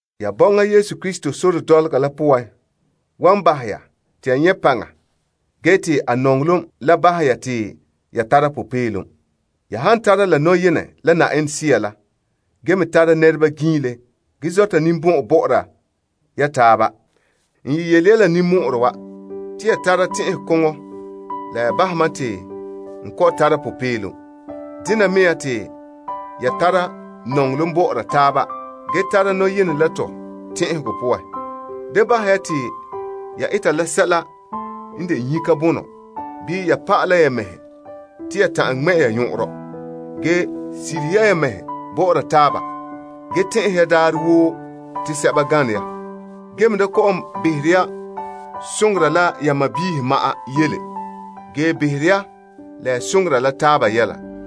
Ya bɔŋa Krista sore dɔlɔga la poan wan bahɛ ya te ya nyɛ' paŋa ge te a nɔŋɔlom la bahɛ ya te ya tara popeelom. Ya han tara la nɔyenɛ la Sea la ge me tara nɛreba giinle ge zɔta ninbɔn'ɔn bɔ'ɔra taaba, n yeti ya la ninmɔ'ɔrɛ wa te ya tara la tɛn'ɛn koŋɔ la ya bahɛ mam te n popeelom perɛ. Tare ya nɔŋɔlom bɔ'ɔra taaba ge tara nɔyenɛ la tɛn'ɛhegɔ koyena. Da bahɛ ya te ya eta la sɛla n de nyika bonɔ bii ya pa'alɛ ya mɛhe te ya ta'an ŋmɛ' ya nyɔn'ɔnrɔ. Ge sirihe ya mɛhe bɔ'ɔra taaba ge tɛn'ɛhe ya daarɛ woo te sɛba gane ya. Gee me da kɔ'ɔn behere ya soŋora la ya mɛhe ma'an yele ge behere ya la ya soŋora la taaba yɛla.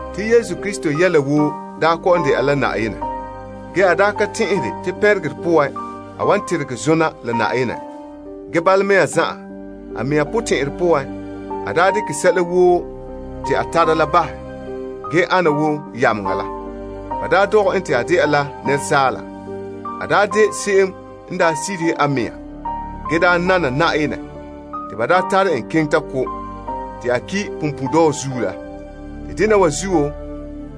Te a yɛla woo daa kɔ'ɔn dɛna la Yenɛ. Ge a daa ka tɛn'ɛhere te pɛnregerɛ poan a wan teregɛ zona la Yenɛ. Ge bala mea zan'an, a mɛŋa potɛn'ɛrɛ poan a daa dekɛ sɛla woo te a tara la bahɛ, ge ana wo yameŋa la. Ba daa dɔgɛ en te a dɛna la asaala. A daa de se'em n daa sirihe a mɛŋa ge daa nana Yenɛ te ba daa tare en keŋɛ ta ko', te a ki' punpuuredɔɔ zuo la. Te dena wa zuo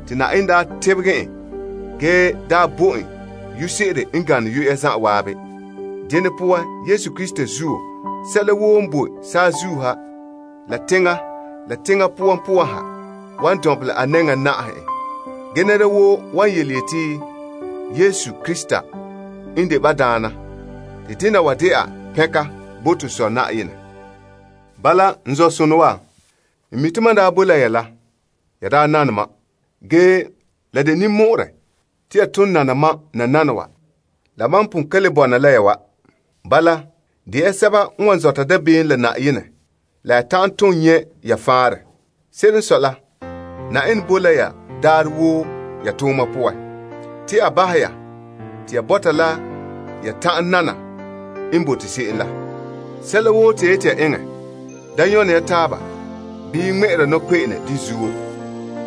te Yenɛ daa tebegɛ en ge daa bo en yu'urɛ se'ere n gane yu'ura zan'an. Dene poan, Yesu yu'urɛ poan, sɛla woo n boe saazuo ha, la teŋa, la teŋa poan poan ha wan dɔnbelɛ a nɛŋa na'aha en. Ge nɛra woo wan yeti Krista n de Na'ayenɛ. Te dena wan dɛna pɛnka bo to Sɔ Yenɛ. Bala, n zɔ'sonɔ wa, n mi' te mam n daa boe la ya la, ya daa nane mam. Ge, la de ninmɔ'ɔrɛ te ya ton nana mam nananawa mam pon ka le bɔna la ya wa. Bala, de ya sɛba n wan zɔta dabeem la Yenɛ la ya ta'an tom nyɛ' ya faanrɛ. Se'ere n sɔe la, Yenɛ boe la ya daarɛ woo ya tooma poan, te a bahɛ ya te ya bɔta la ya ta'an nana n bote se'em la. Sɛla woo te ya yeti ya eŋɛ, da nyɔne ya taaba bii ŋmɛ'ɛra nɔkpe'ene de zuo.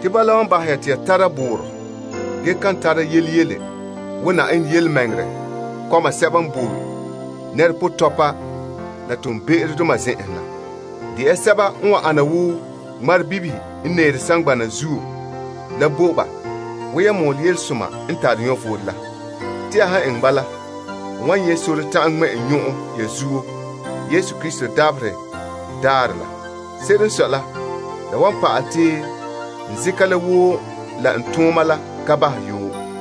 Bala wan bahɛ te ya tara dɛngerɔ, ka tara ganleŋɔ, ge dɛna Yenɛ yelemɛŋɛrɛ kɔma sɛba n boe nɛrepotɔpa la toonbe'erodoma zen'enhe la. Nɛɛre ya wo ŋmarebibihe n boe saŋgbanɛ zuo la bo ba, wo yan mɔɔlɛ yelesoma n tare vom kena na la bo ba. Te ya han eŋɛ bala, n wan nyɛ' sore ta'an ŋmɛ' n nyɔn'ɔn ya zuo Krista dabaherɛ daarɛ la. Se'ere n sɔe la, la wan pa'alɛ te n zeka la woo la n tooma la ka bahɛ yoo.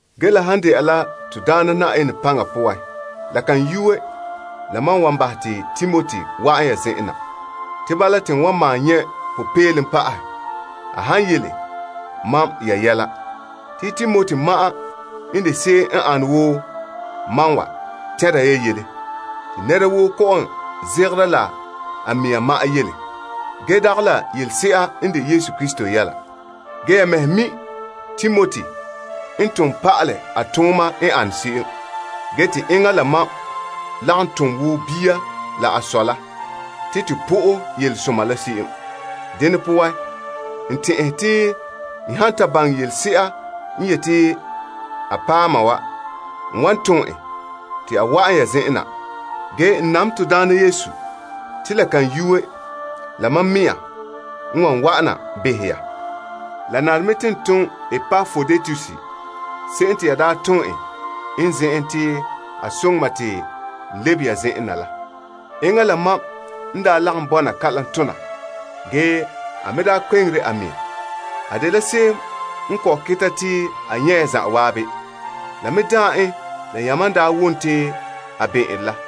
Ge la han dɛna la Na'ayenɛ Yesu potɛn'ɛrɛ, la kan yuue la mam wan bahɛ te Timoti wa'an ya zen'en na. Te bala te n wan malom nyɛ' popeelom pa'ahɛ a han yele mam ya yɛla. Te Timoti ma'an n de se'em n ane wo mam wa tɛnra ya yɛla. Te nɛra woo kɔ'ɔn zegera la a mɛŋa ma'an yele. Ge dagɛ la yelese'a n de Yesu Krista yɛla. Ge ya mɛhe mi' Timoti n tom pa'alɛ a tooma n ane se'em. Ge te enŋa la mam lagom tom wo bia la a sɔ la te to po'e yelesoma la se'em. Dene poan, n han ta baŋɛ la wan ta ana mam se'em, n wan tom en te a wa'an ya zen'an na. Ge n nam Na'ayenɛ te la kan yuue la mam mɛŋa wan wa'an na behɛ ya. La nare me te n tom Epaproditus se'em te ya daa tom en n zen'en te a soŋɛ mam te a lebe ya zen'en na. Enŋa la mam n daa lagom bɔna kalam tona ge a me daa kpeŋera a mɛŋa. A dela se'em n kɔ'ɔn keta te a nyɛ' ya zan'an. La me daam en la yamam n daa wom te a bɛn'ɛnre la.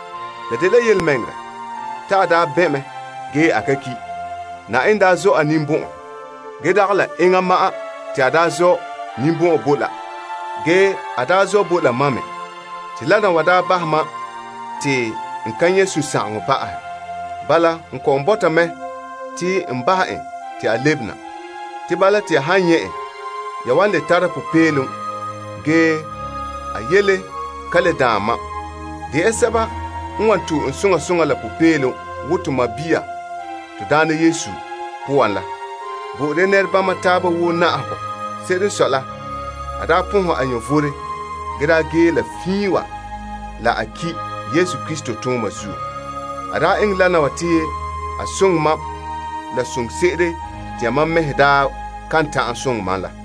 La dela yelemɛŋɛrɛ te a daa bɛn' mɛ ge a ki'. Ge Yenɛ daa zɔ' a ninbɔn'ɔn. Ge dagɛ la enŋa ma'an te a daa zɔ' ninbɔn'ɔn bo la, ge a daa zɔ' bo la mam me mɛ, te dena wa daa bahɛ mam te n ka nyɛ' sunsagaŋɔ pa'ahɛ. Bala, n kɔ'ɔn bɔta mɛ te n bahɛ en te a lebe na. Te bala te ya han nyɛ' en, ya wan le tara popeelom ge a yele ka le daan mam me. To'e ya en soŋa soŋa la popeelom wo to sɔɔn Na'ayenɛ poan la. Bo'ore ya nɛrebama taaba woo na'ahegɔ wo enŋa la. Se'ere n sɔe la, a daa pɔnhɛ a vom ge daa gee la fiin wa la, a ki' Krista tooma zuo. A daa eŋɛ dena wa te a soŋɛ mam la soŋse'ere te yamam mɛhe daa kan ta'an soŋɛ mam la.